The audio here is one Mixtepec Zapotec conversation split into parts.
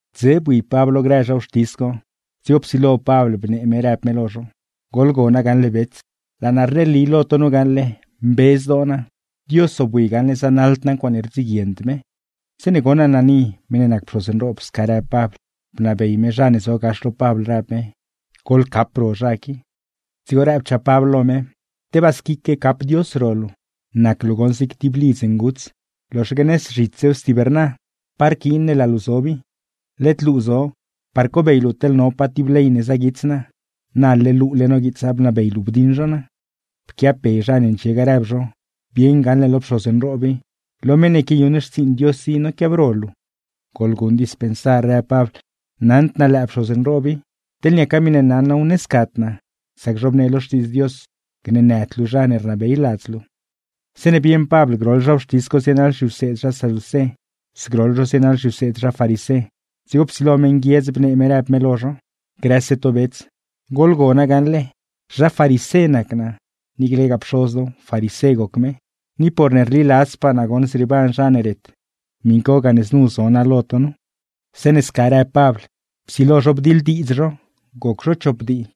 Dze bui Pabl lo grë zha wxtis co, dzigo psilo Pabl bnee me rëb me lo zho: ―Laa naa rneli lo to nu gaṉle, mbe zdoo naa, Dios zobwi gaṉle zanaḻd naa ncuaaṉe rdziguiend me. Zeeṉe goṉ Ananí (meṉ ne nac pxoz nroob) sca rëb Pabl, bnabey me zha ne zo gax lo Pabl, rëb me: ―¡Goḻcap ro zha qui! Dzigo rëbchaa Pabl lo me: ―¡Tebaa squique cap Dios ro luu! ¡Nac luu goṉ zig ti lidz nguts loxaque nëz zhitssew stib rna! ¿Pa rquiin ne laa luu zob i? Led luu zo par cobey luu teḻ no pa ti ley ne zaguits naa, na leḻ luule noguiitsa bnabey luu bdiṉ zho naa. Pquiabbe zha ne ndxie ga rëb zho: ―¡Bieṉ gaṉle lo pxoz nroob i, lo meṉ ne quiayuṉ xtsiiṉ Dios i noquiabro luu! ―Goḻguṉ dispensar ―rëb Pabl―. Naṉd naa lëë pxoz nroob i, teḻ niaca miṉe naṉ naaw ne scad naa; sac zhobnee lo Xtiidz Dios: “Gneenëd luu zha ne rnabey ladz luu.” Zeeṉe bieṉ Pabl groḻ zha wxtis co zienaḻ zhiwseed zha saducé, zgroḻ zho zienaḻ zhiwseed zha farisé, dzigo psilo me nguiedz bnee me rëb me lo zho: ―¡Grëse to bets, goḻgona gaṉle, zha farisé nac naa, niiclegaa pxoz naaw farisé goc me! ¡Ni porne rliladzpaa naa goṉ zrieeban zha ne ret, miṉ co gane znu zo naa lo to nu! Zeeṉe sca rëb Pabl, psilo zho bdiḻdiidz zho. Goc zho chop dii,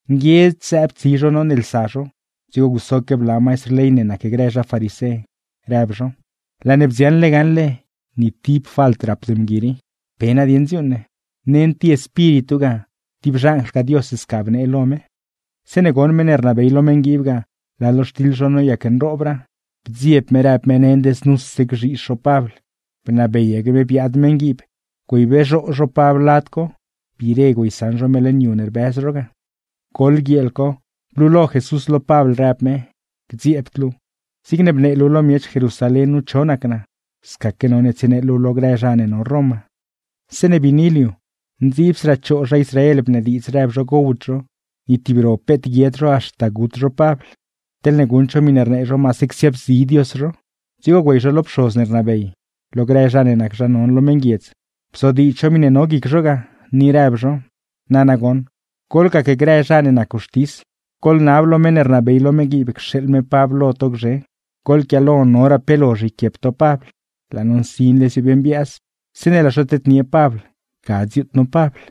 Nguiedz zëëb tsi zho noneelsa zho, dzigo gusoque bla maistr ley ne nacgrë zha farisé, rëb zho: ―Laa ne bdziaṉle gaṉle, ¡ni ti falt rapd mgui qui! ¿Pe nadieṉ dziuuṉ ne? Nend ti espíritu ga, ti xanjlgaa Dios ga sca bnee lo me. Zeeṉe goṉ meṉ ne rnabey lo meṉguiib ga, laa lo xtiḻ zho noyac nroobraa, bdzieb me rëb me nend znuse gzhiizh zho Pabl; bnabeyaque me gocredz meṉguiib güeyxi zho Pabl biire güeysaṉ zho me leṉ yu ne rbëz zho ga. Goḻ guieel co, blulo Dios lo Pabl rëb me: ―Gdzieebd luu, zigne bnee luu xtidz naa lo miech Jerusalén nu, scaque none tsienee luuw lo grë zha ne no Roma. Zeeṉe biini liu, ndziibsraa choo zha Israel bnediidz rëb zho gowd zho, ni tib ro peet guied zho haxta gut zho Pabl; teḻne guṉd zho miṉe rnee zho maase csiaabzi Dios zho. Dzigo güey zho lo pxoz ne rnabey, lo grë zha ne nac zha non lo meṉguiedz, bzodiidz zho miṉe no guic zho ga, ni rëb zho: ―Nana goṉ, goḻnab lo meṉ ne rnabey lo meṉguiib cxeeḻ me Pabl lo to gzhe, goḻquiaalo noraa pe lozh yquiep to Pabl; laa no nsinle ziobmbiaaz. Zeeṉe laa zho tednie Pabl, ga dziuut no Pabl.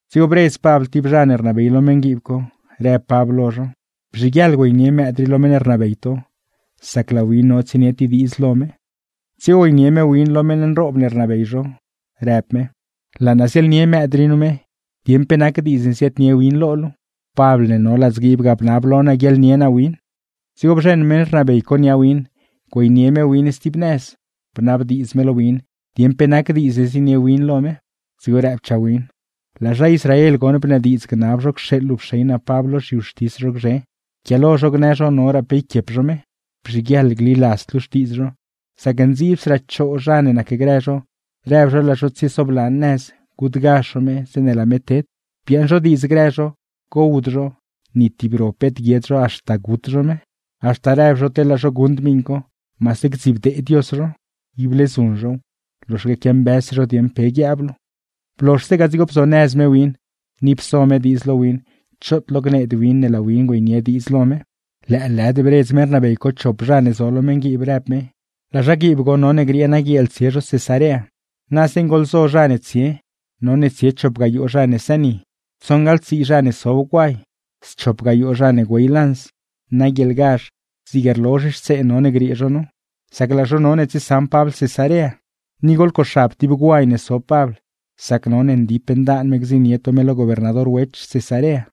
Dzigo bredz Pabl ti zha ne rnabey lo meṉguiib co, rëb Pabl lo zho: ―Bzhiguieḻ güeynie mëëd rii lo meṉ ne rnabey to, sac laa win no tsienie ti diidz lo me. Bzheṉ meṉ rnabey co nia mëëd co, güeynie me win lo meṉ nroob ne rnabey zho, rëb me: ―Laa naa ziaḻnie mëëd rii nu me, dieṉ pe nac diidz ne ziaadnie win lo luu; Pabl ne no ladzguiib ga bnab lo naa guiaḻnie naa win. Dzigo bzheṉ meṉ rnabey co nia win, güeynie me win stib nëz, bnabdiidz me lo win dieṉ pe nac diidz ne zienie win lo me. Dzigo rëbchaa win: ―Laa zha Israel goṉ bnediidz gnab zho cxeeḻ luu pxey naa Pabl lo zhiwxtis zho gzhe, yquiaalo zho gnë zho noraa pe yquiep zho me. Bzhiguieḻ gliladzd luu xtiidz zho, sac ndziibsraa choo zha ne nacgrë zho rëb zho laa zho tsiesoblan nëz gutgazh zho me zeeṉe laa me ted. Biaaṉ zho diidz grë zho, gowd zho, ni tib ro peet guied zho haxta gut zho me; haxta rëb zho teḻ laa zho guṉd miṉ co maase gdzibdee Dios zho. Ible zuṉ zhow, loxaque quiambëzse zho dieṉ pe guiab luu. Blozhse ga dzigo bzonëz me win, ni pso me diidz lo win choot lo gneed win ne laa win güeynie diidz lo me. Lëëlëd bredz meṉ rnabey co chop zha ne zo lo meṉguiib, rëb me: ―Laa zhaguiib goṉ none griee naguieel tsie zho Cesarea, na zeeṉ goḻzo zha ne tsie; none tsie chop gayoo zha ne sëni, tsoṉgaḻ tsii zha ne sob guay, schop gayoo zha ne güey lanz. Naguieelgazh, zig rlozh xtsee none griee zho nu; sac laa zho none tsiesaṉ Pabl Cesarea. Ni goḻcoxab ti guay ne sob Pabl, sac none ndip ndaan me gdziṉnie to me lo gobernador Wech Cesarea.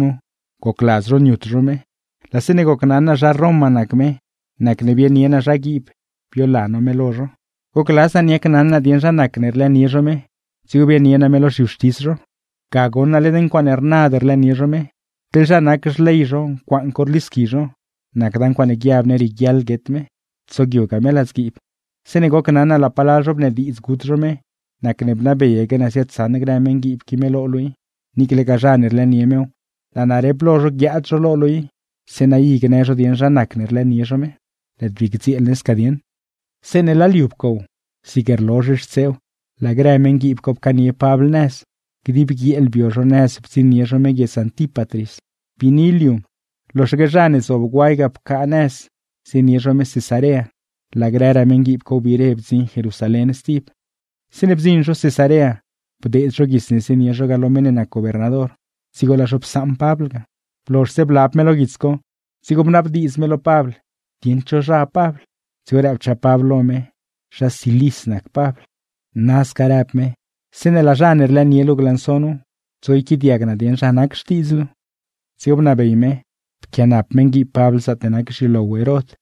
’Zha Israel bnaaz me gocladz zho niut zho me, laa zeeṉe gocnaṉ naa zha Roma nac me nacne pxeeḻaque naa zhaguiib güeyla me lo zho. Gocladz naa niacnaṉ naa dieṉ zha nacne rlëënie zho me, dzigo bianie naa me lo zhiwxtis zho. Ga goṉ naa led ncuaaṉe rnad rlëënie zho me; teḻ zha nac xley zho ncuaaṉ co rlisqui zho; nacda ncuaaṉe guiab ne rieguiaḻ guet me, tsogyugaa me ladzguiib. Zeeṉe gocnaṉ naa laa palal zho bnediidz gut zho me, nacne bnabeyaque naa ziaadsaṉ grë meṉguiib qui me lo luu i. Niiclegaa zha ne rlëënie mew, laa naa rep lo zho guiaad zho lo luu i, zeeṉa i gnë zho dieṉ zha nacne rlëënie zho me. ’Lëëd bii gdzieel ne sca dieṉ.” Zeeṉe laa liu pcow, zig rlozh xtseew laa grë meṉguiib co pcaanie Pabl nëz; dib guieel bio zho nëz bdziṉnie zho me guiedz Antípatris. Biini liu, loxaque zha ne zob guay ga pcaa nëz zienie zho me Cesarea, laa grëraa meṉguiib co wbire bdziṉ Jerusalén stib. Zeeṉe bdziṉ zho Cesarea, bdeed zho guits ne zienie zho ga lo meṉ ne nac gobernador, dzigo laa zho psaṉ Pabl ga. Blozhse blab me lo guits co, dzigo bnabdiidz me lo Pabl dieṉ pa guiedz gol Pabl. Dzigo rëbchaa Pabl lo me, zha Cilis nac Pabl. ―Nasca ―rëb me―, zeeṉe laa zha ne rlëënie luu glanso nu, dzigo yquiaadiag naa dieṉ zhapaa nac xtiḻ to. Dzigo bnabey me, pquianap meṉguiib Pabl zaatne nac leṉ xyulow Herod.